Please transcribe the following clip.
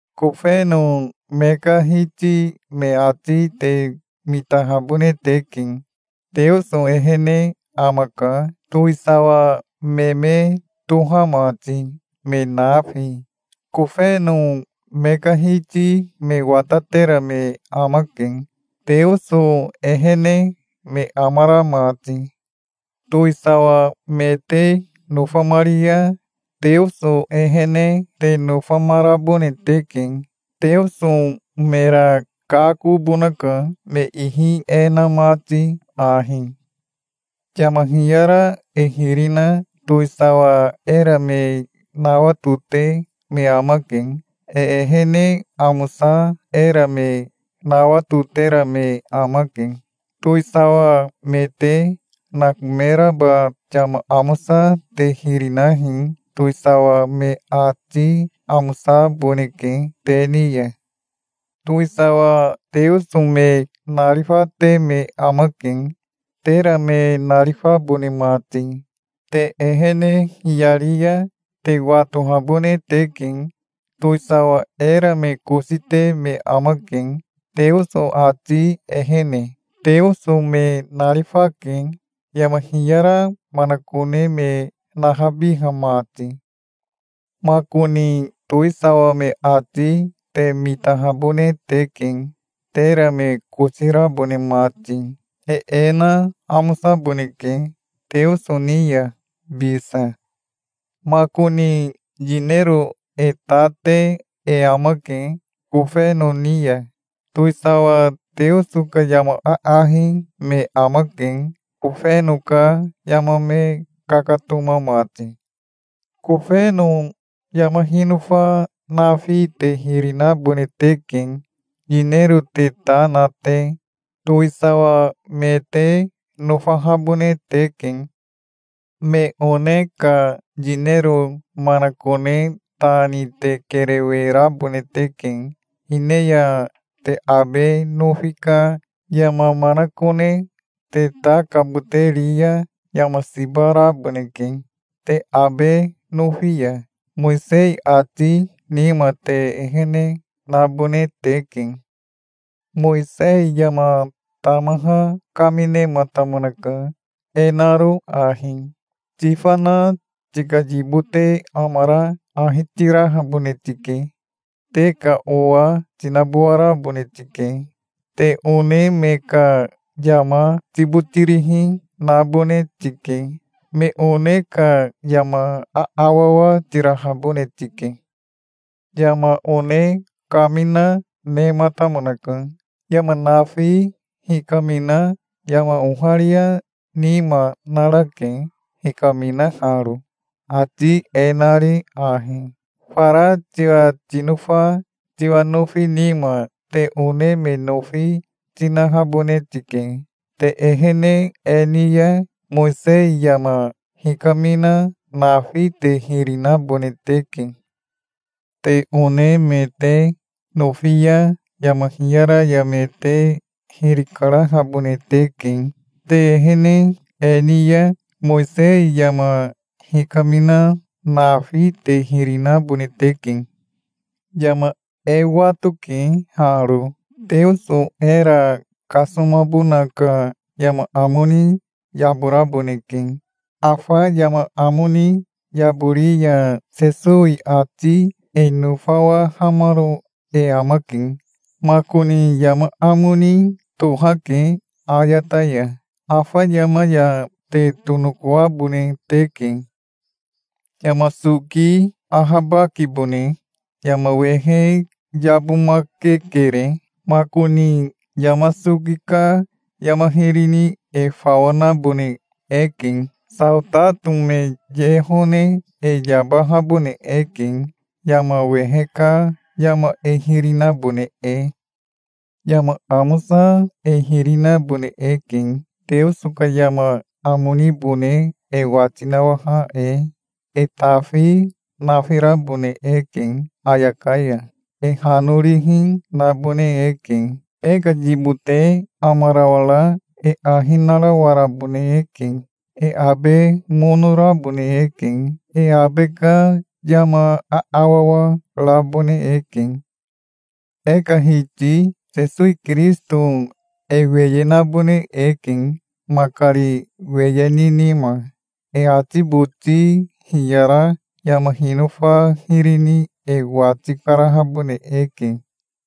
Kofeno me ka hiti me ati te mitahabone teke. Teoso ehene amaka, towisawa me me toha mati, me nafi. Kofeno me ka hiti me watatera me amake, Teoso ehene me amara mati. Towisawa me te nofamari ya Teoso ehene te nofamarabone teke. Teoso mera kakobonaka, me ihi e na mati ahi. Yama hiyara e hiri na towisawa era me nawatote me amake. E ehene amosa era me nawatotera me amake. Towisawa me te nakomeraba yama amosa te hiri nahi. Towisawa me ati amosaboneke te ni ya. Towisawa Teoso me narifate me amake, tera me narifabone mati. Te ehene hiyari ya te watohabone teke. Towisawa era me kosi te me amake, Teoso ati ehene. Teoso me narifake, yama hiyara manakone me nahabiha mati. Makoni towisawa me ati te mitahabone teke, tera me kosi rabone mati. E e na amosaboneke Teoso ni ya bisa. Makoni yinero e ta te e amake kofeno ni ya. Towisawa Teoso ka yama aahi me amake, kofeno ka yama me kakatoma mati. Kofeno yama hinofa nafi te hiri nabone teke, yinero te ta na te. Towisawa me te nofahabone teke. Me one ka yinero manakone ta ni te kerewe rabone teke. Hine ya te abe nofi ka yama manakone te ta kabote ri ya yama siba raboneke. Te abe nofi ya Mowisei ati nima te ehene nabone teke. Mowisei yama tamaha kaminematamonaka, e naro ahi: "Tifana tika yibote amara ahi tirahabone tike. Te ka owa tinabowarabone tike. Te one me ka yama tibotirihi nabone tike. Me one ka yama aawawa tirahabone tike". Yama one kamina nematamonaka. Yama nafi hikamina yama oharia nima narake hikaminaharo, ati e nari ahi: "Fara tiwa tinofa tiwa nofi nima te one me nofi tinahabone tike". Te ehene e ni ya, Mowisei yama hikamina nafi te hiri nabone teke. Te one me te nofi ya yama hiyara ya me te hiri karahabone teke. Te ehene e ni ya, Mowisei yama hikamina nafi te hiri nabone teke. Yama e watoke haro. Teoso era kasomabona ka yama amo ni yaboraboneke. Afa yama amo ni yabori ya Sesowi ati e nofawahamaro e amake. Makoni yama amo ni tohake ayata ya. Afa yama ya te tonokoabone teke. Yama soki ahabakibone. Yama wehe yabomakekere. Makoni yama soki ka yama hiri ni e fawa nabone eke. Saotato me ye hone e yabahabone eke, yama wehe ka yama e hiri nabone e. Yama amosa e hiri nabone eke, Teoso ka yama amo nibone e wati nawaha e. E tafi nafirabone eke ayaka ya. E hanorihi nabone eke. E ka yibote amarawara e ahi narawarabone eke. E abe mono rabone eke. E abe ka yama aawawa rabone eke. E ka Hiti Sesowi Kirisito e weye nabone eke, makari weye ni nima. E ati boti hiyara yama hinofa hiri ni e wati karahabone eke.